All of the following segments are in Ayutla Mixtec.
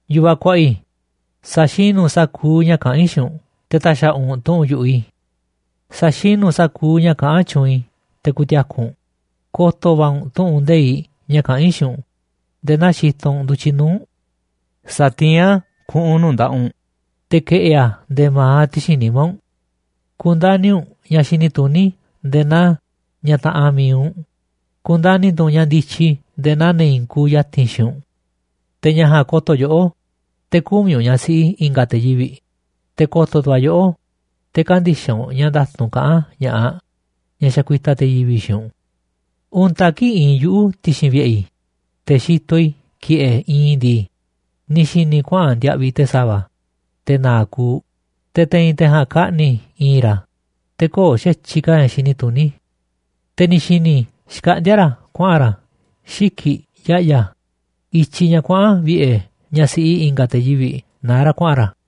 Yu̱vaꞌ kuaꞌa i̱, sa̱xinu̱ u̱nꞌ sa̱kuuꞌ ña̱ kaꞌán i̱ xiinꞌ u̱nꞌ, te̱ ta̱xa̱ꞌa̱ u̱nꞌ tu̱ꞌu̱n yu̱ꞌuꞌ i̱. Sa̱xinu̱ u̱nꞌ sa̱kuuꞌ ña̱ kaꞌán tyuunꞌ i̱, te̱ ku̱ti̱a̱ku̱ u̱nꞌ, ko̱to̱ va̱ u̱nꞌ tu̱ꞌu̱n nde̱iꞌ ña̱ kaꞌán i̱ xiinꞌ u̱nꞌ nde̱e̱ naa xitoꞌ u̱nꞌ ndu̱tyiꞌ nuu̱ꞌ u̱nꞌ. Sa̱tiín a̱ ku̱ꞌu̱n nuu̱ꞌ nda̱ꞌaꞌ u̱nꞌ, te̱ ke̱ꞌi̱ a̱ nde̱e̱ ma̱aꞌ ti̱xi̱n nimá u̱nꞌ. Ku̱ndani̱ u̱nꞌ ña̱ xini tuní nde̱e̱ naa ñaꞌ taꞌanꞌ mi̱iꞌ u̱nꞌ, ku̱ndani̱ tu̱ u̱nꞌ ña̱ ndityi nde̱e̱ naa ne̱ i̱i̱n kuuꞌ ya̱ti̱n xiinꞌ u̱nꞌ. Te̱ ña̱ ja̱a̱nꞌ ko̱to̱ yoꞌó te̱ kü̱miꞌ u̱nꞌ ñaꞌ siꞌi i̱nga̱ te̱ yivi̱ꞌ, te̱ ko̱to̱ tu̱ a̱ yoꞌó te̱ kä̱ndi̱xaꞌ u̱nꞌ ña̱ nda̱tu̱nꞌ kaꞌán ña̱ꞌaꞌ ñaꞌ xakuitaꞌ te̱ yivi̱ꞌ xiinꞌ u̱nꞌ. Untaꞌ kii̱ꞌ iinꞌ yuꞌu̱ ti̱xi̱n vi̱ꞌe̱ i̱, te̱ xitoꞌ i̱ ki̱ꞌe̱ iinꞌ i̱ ndii, ni̱ xi̱ni̱ i̱ kuaꞌa̱n ndiaꞌviꞌ te̱ sa̱va̱, te̱ na̱a̱ꞌ kuuꞌ, te̱ te̱i̱n te̱ ja̱a̱nꞌ kaꞌni̱ i̱i̱n ra̱, te̱ köo̱ꞌ xa̱tyiꞌ ka̱ ña̱ xini tuní. Te̱ ni̱ xi̱ni̱ i̱ xkaꞌndíá ra̱ kuaꞌa̱n ra̱ xiki̱ꞌ ya̱ꞌya̱, i̱tyiꞌ ña̱ kuaꞌa̱n vi̱ꞌe̱ ñaꞌ siꞌi i̱nga̱ te̱ yivi̱ꞌ naá ra̱ kuaꞌa̱n ra̱.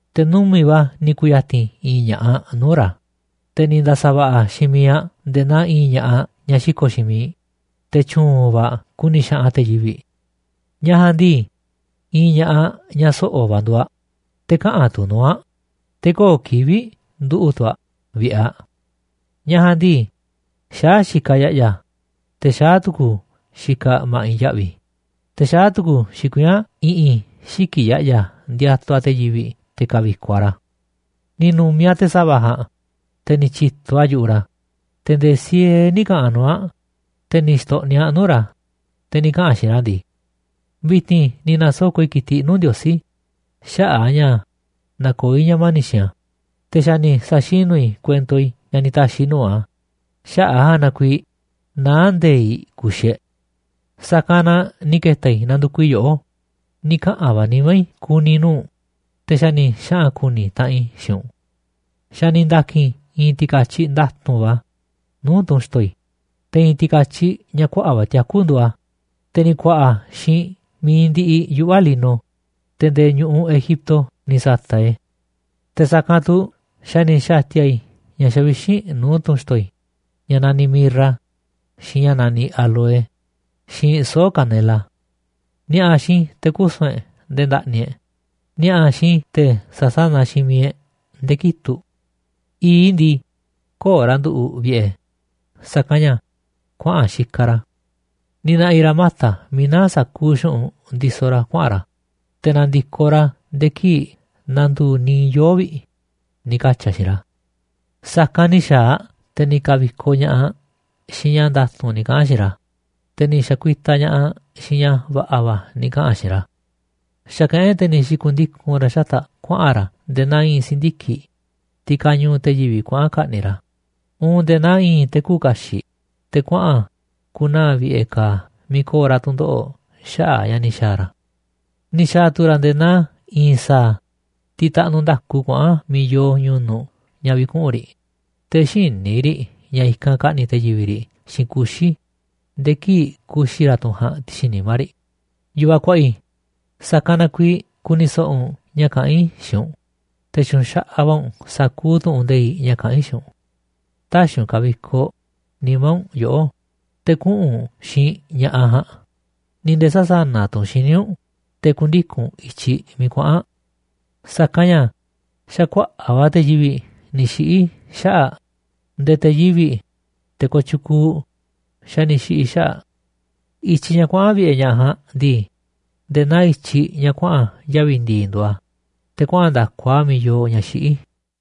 Te̱ numi̱ꞌ va̱ ni̱ ku̱ya̱ti̱n i̱i̱n ña̱ꞌaꞌ nuu̱ꞌ ra̱, te̱ ni̱ nda̱sa̱va̱ꞌa̱ xiinꞌ miiꞌ aꞌ nde̱e̱ naa i̱i̱n ña̱ꞌaꞌ ñaꞌ xiko̱ꞌ xiinꞌ miiꞌ, te̱ tyu̱u̱n va̱ aꞌ ku̱ni̱ xaꞌanꞌ aꞌ te̱ yivi̱ꞌ. Ñaꞌ ja̱a̱nꞌ ndii, i̱i̱n ña̱ꞌaꞌ ñaꞌ so̱ꞌo̱ va̱ nduuꞌ aꞌ, te̱ käꞌanꞌ tu̱ nuu̱ꞌ aꞌ, te̱ köo̱ꞌ kivi̱ꞌ nduꞌu̱ꞌ tu̱ aꞌ vi̱ꞌe̱ aꞌ. Ñaꞌ ja̱a̱nꞌ ndii, xaá xikaꞌ aꞌ ya̱ꞌya̱, te̱ xaá tu̱ku̱u̱ xikaꞌ aꞌ ma̱ꞌiꞌ ya̱ꞌvi̱, te̱ xaá tu̱ku̱u̱ xikuiín aꞌ i̱ꞌi̱n xiki̱ꞌ ya̱ꞌya̱ ndiatuꞌ aꞌ te̱ yivi̱ꞌ te̱ ka̱vi̱koꞌ aꞌ ra̱. Ni̱ nu̱mi̱ aꞌ te̱ sa̱va̱ ja̱a̱nꞌ, te̱ ni̱ tyi̱to aꞌ yu̱ꞌuꞌ ra̱, te̱ nde̱e̱ siee nï̱ ka̱ꞌa̱n nuu̱ꞌ aꞌ, te̱ ni̱ xto̱ꞌni̱ aꞌ nuu̱ꞌ ra̱, te̱ ni̱ kaꞌa̱n aꞌ xiinꞌ ra̱ ndii: “Vi̱ti̱n ni̱ na̱soko̱ꞌ i̱ ki̱tiꞌ nuu̱ꞌ Ndiosí xaꞌa̱ꞌ a̱ ña̱ nakoó i̱ ña̱ mani̱ꞌ xiinꞌ a̱, te̱ xa̱ ni̱ sa̱xinu̱ i̱ kuento i̱ ña̱ ni̱ ta̱xi̱ i̱ nuu̱ꞌ a̱, xaꞌa̱ꞌ a̱ ja̱a̱nꞌ na kuiiꞌ naá nde̱i̱i̱ꞌ ku̱xi̱ e̱ꞌ. Sa̱kanꞌ na ni̱ ke̱ta̱ i̱ nandukuꞌ i̱ yoꞌó, ni̱ kaꞌa̱n va̱ nimá i̱ ku̱ni̱ nuu̱ꞌ u̱nꞌ, te̱ xa̱ ni̱ xaꞌa̱n ku̱ni̱ taꞌanꞌ i̱ xiinꞌ u̱nꞌ. Xa̱ ni̱ nda̱ki̱n i̱ i̱i̱n ti̱ka̱tyiꞌ nda̱tu̱nꞌ va̱ nuu̱ꞌ tunꞌ xi̱to̱ i̱, te̱ i̱i̱n ti̱ka̱tyiꞌ ña̱ kuaꞌa̱ꞌ va̱ tiaku̱ nduuꞌ a̱, te̱ ni̱ ku̱a̱ꞌa̱ a̱ xiinꞌ mi̱iꞌ ndiꞌiꞌ yuꞌva̱ lino, te̱ nde̱e̱ ñu̱ꞌuꞌ Egipto ni̱ sa̱ta̱ꞌ i̱ e̱. Te̱ sa̱kanꞌ tu̱ xa̱ ni̱ xa̱ti̱a̱ i̱ ña̱ xavixínꞌ nuu̱ꞌ tunꞌ xi̱to̱ i̱ ña̱ naniꞌ mirra, xiinꞌ ña̱ naniꞌ áloe, xiinꞌ soo̱ꞌ kanela. Ni̱a̱ꞌa̱ xiinꞌ i̱ te̱ kusu̱n e̱ꞌ nde̱e̱ nda̱ꞌni̱ e̱ꞌ, ni̱a̱ꞌa̱ xiinꞌ i̱ te̱ sa̱sánaꞌ xiinꞌ miiꞌ e̱ꞌ nde̱e̱ kitu̱ꞌ. I̱i̱ꞌ i̱ ndii, köo̱ꞌ ra̱ nduꞌu̱ꞌ vi̱ꞌe̱, sa̱kanꞌ ña̱ kuaꞌa̱n xikaꞌ ra̱. Ni̱ na̱ꞌi̱ ra̱ mata̱ miiꞌ naá sa̱kuuꞌ xu̱ꞌunꞌ ndisoꞌ ra̱ kuaꞌa̱n ra̱, te̱ na̱ndi̱koꞌ ra̱ nde̱e̱ kii̱ꞌ na̱ndu̱u̱ niiꞌ yoo̱ꞌ vi̱ꞌ”, ni̱ katyi̱ aꞌ xiinꞌ ra̱. Sa̱kanꞌ ni̱ xa̱a̱ aꞌ, te̱ ni̱ ka̱vi̱koꞌ ña̱ꞌaꞌ aꞌ xiinꞌ ña̱ nda̱tu̱nꞌ ni̱ kaꞌa̱n aꞌ xiinꞌ ra̱, te̱ ni̱ xa̱kuitaꞌ ña̱ꞌaꞌ aꞌ xiinꞌ ña̱ va̱ꞌa̱ va̱ ni̱ kaꞌa̱n aꞌ xiinꞌ ra̱. Xa̱kaꞌán e̱ꞌ te̱ ni̱ xi̱ku̱ndiku̱n ra̱ xata̱ꞌ aꞌ kuaꞌa̱n ra̱ nde̱e̱ naa i̱i̱n si̱ndiki̱ꞌ, tiꞌ kañuuꞌ te̱ yivi̱ꞌ kuaꞌa̱n ka̱ꞌni̱ꞌ ra̱, uun nde̱e̱ naa i̱i̱n te̱ küuꞌ kaxiꞌ te̱ kuaꞌa̱n ku̱naa̱ vi̱ꞌe̱ ka̱a̱ miiꞌ ko̱o̱ ra̱ tu̱ndoꞌo̱ꞌ xaꞌa̱ꞌ ña̱ ni̱ xa̱a̱ ra̱. Ni̱ xa̱a̱ tu̱ ra̱ nde̱e̱ naa i̱i̱n sa̱a̱, tiꞌ taꞌnuꞌ nda̱ku kuaꞌa̱n miiꞌ yoo ñu̱nu̱ꞌ ña̱ vi̱kuꞌu̱n riꞌ, te̱ xïní riꞌ ña̱ i̱kanꞌ ka̱ꞌni̱ꞌ te̱ yivi̱ꞌ riꞌ xiinꞌ kuxi̱, nde̱e̱ kii̱ꞌ kuxi̱ ra̱ tunꞌ ja̱a̱nꞌ ti̱xi̱n nimá riꞌ. Yu̱vaꞌ kuaꞌa i̱, sa̱kanꞌ na kuiiꞌ ku̱ni̱ so̱ꞌo̱ u̱nꞌ ña̱ kaꞌán i̱ xiinꞌ u̱nꞌ, te̱ tyu̱u̱n xaꞌaꞌ va̱ u̱nꞌ sa̱kuuꞌ tu̱ꞌu̱n nde̱iꞌ ña̱ kaꞌán i̱ xiinꞌ u̱nꞌ. Tä̱xi̱ u̱nꞌ ka̱vi̱koꞌ nimá u̱nꞌ yoꞌó te̱ kuꞌu̱n u̱nꞌ xiinꞌ ña̱ꞌaꞌ ja̱a̱nꞌ, ni̱ nde̱e̱ sä̱sanaꞌ tu̱ u̱nꞌ xíniꞌ u̱nꞌ te̱ ku̱ndiku̱n u̱nꞌ i̱tyiꞌ miiꞌ kuaꞌa̱n aꞌ. Sa̱kanꞌ ña̱ xa̱ kuaꞌa̱ꞌ va̱ te̱ yivi̱ꞌ ni̱ xiꞌi̱ xaꞌa̱ꞌ aꞌ, nde̱e̱ te̱ yivi̱ꞌ, te̱ kooꞌ tyukuuꞌ, xa̱ ni̱ xiꞌi̱ xaꞌa̱ꞌ aꞌ. I̱tyiꞌ ña̱ kuaꞌa̱n vi̱ꞌe̱ ñaꞌ ja̱a̱nꞌ ndii, nde̱e̱ naa i̱tyiꞌ ña̱ kuaꞌa̱n yavi̱ ndi̱i̱ nduuꞌ a̱, te̱ kuaꞌa̱n nda̱ku a̱ miiꞌ yoo ña̱ xiꞌí.